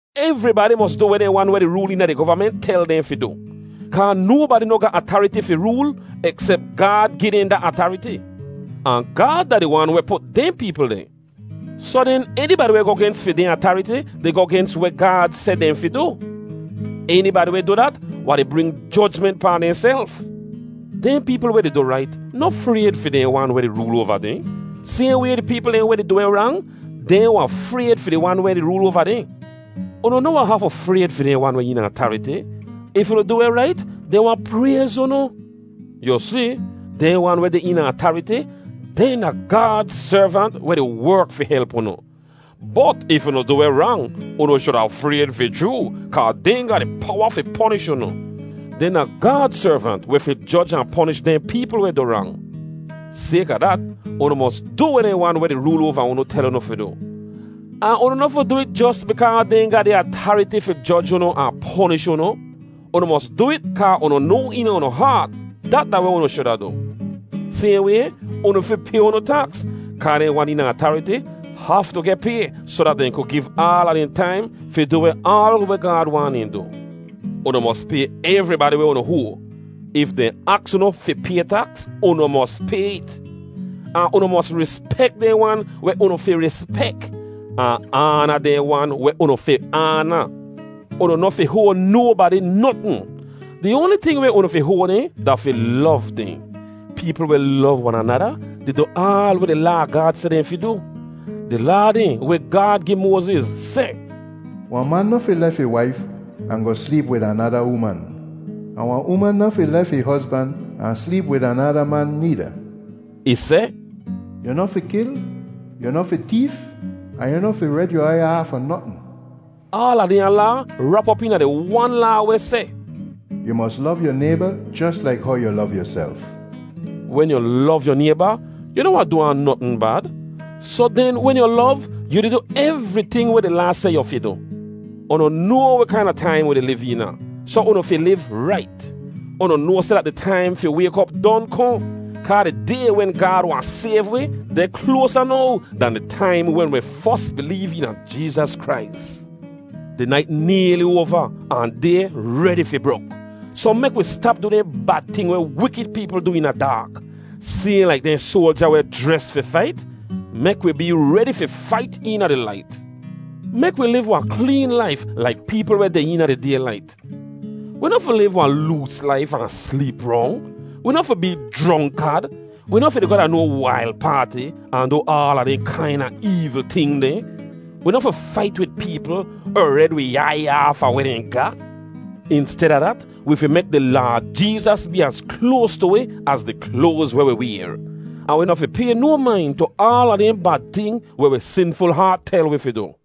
Evribadi mos du weh dehn wan weh di rool eena di govament tel dehn fi du. Kaa nobadi noh ga atariti fi rool eksep Gaad gi dehn da atariti. Ahn Gaad da di wan weh put dehn peepl deh. Soh den, enibadi weh goh gens fi dehn atariti di goh gens weh Gaad seh dehn fi du. Enibadi weh du dat wahn di bring jojment pahn dehnself. Dehn peepl weh di du weh rait noh frayd fi dehn wan weh di rool oava dehn. Sayhn way, di peepl dehn weh di du weh rang, dehn wahn frayd fi di wan weh di rool oava dehn. Unu noh wahn hafu frayd fi dehn wan weh eena atariti. If unu du weh rait, dehn wahn prayz unu. Yu si, dehn wan weh deh eena atariti, dehn da Gaad servant weh di werk fi help unu. Bot if unu du weh rang, unu shuda frayd fi chroo, kaa dehn ga powa fi ponish unu. Dehn da Gaad servant weh fi joj ahn ponish dehn peepl weh du rang. Sayka dat, unu mos du weh dehn wan weh di rool oava unu tel unu fi du. Ahn unu noh fi du it jos bikaa dehn ga atariti fi joj unu ahn ponish unu. Unu mos du it kaa unu noa eena unu haat dat da weh unu shuda du. Sayhn way, unu fi pay unu taks, kaa dehn wan eena atariti haftu geh pay soh dat dehn ku giv aala dehn taim fi du weh aal weh Gaad waahn dehn du. Unu mos pay evribadi weh unu hoa. If dehn aks unu fi pay taks, unu mos pay it. Ahn unu mos rispek dehn wan weh unu fi rispek ahn aana dehn wan weh unu fi aana. Unu noh fi hoa nobadi notn. Di oanli ting weh unu fi hoa dehn da fi lov dehn. Peepl weh lov wan anada di du aal weh di Laa a Gaad seh dehn fi du. Di Laa dehn weh Gaad gi Moaziz seh, “Wahn man noh fi lef ih waif ahn goh sleep wid anada uman, ahn wahn uman noh fi lef ih hozban ahn sleep wid anada man needa.” Ih seh, “Yu noh fi kil, yu noh fi teef, ahn yu noh fi red yu aiy aafa notn.” Aala dehnya laa rap op eena di wan laa weh seh, “Yu mos lov yu nayba jos laik how yu lov yuself.” Wen yu lov yu nayba, yu noh wahn du ahn notn bad. Soh den wen yu lov, yu di du evriting weh di Laa seh yu fi du. Unu noa weh kaina taim wi di liv eena, soh unu fi liv rait. Unu noa seh dat di taim fi wayk op don kohn, kaa di Day wen Gaad wahn sayv wi deh kloasa now dan di taim wen wi fos bileev eena Jeezas Krais. Di nait nayli oava ahn day redi fi brok, soh mek wi stap du dehn bad ting weh wikid peepl du eena daak. Sayhn laik dehn soalja weh jres fi fait, mek wi bee redi fi fait eena di lait. Mek wi liv wahn kleen laif laik peepl weh deh eena di daylait. Wi noh fi liv wahn loos laif ahn sleep rong. Wi noh fi bee jronkad. Wi noh fi di goh da no wail paati ahn du aala dehn kaina eevl ting dehn. Wi noh fi fait wid peepl er red wi aiy aafa weh dehn ga. Insteda dat, wi fi mek di Laad Jeezas bee az kloas tu wi az di kloaz weh wi wayr. Ahn wi noh fi pay no main tu aala dehn bad ting weh wi sinful haat tel wi fi du.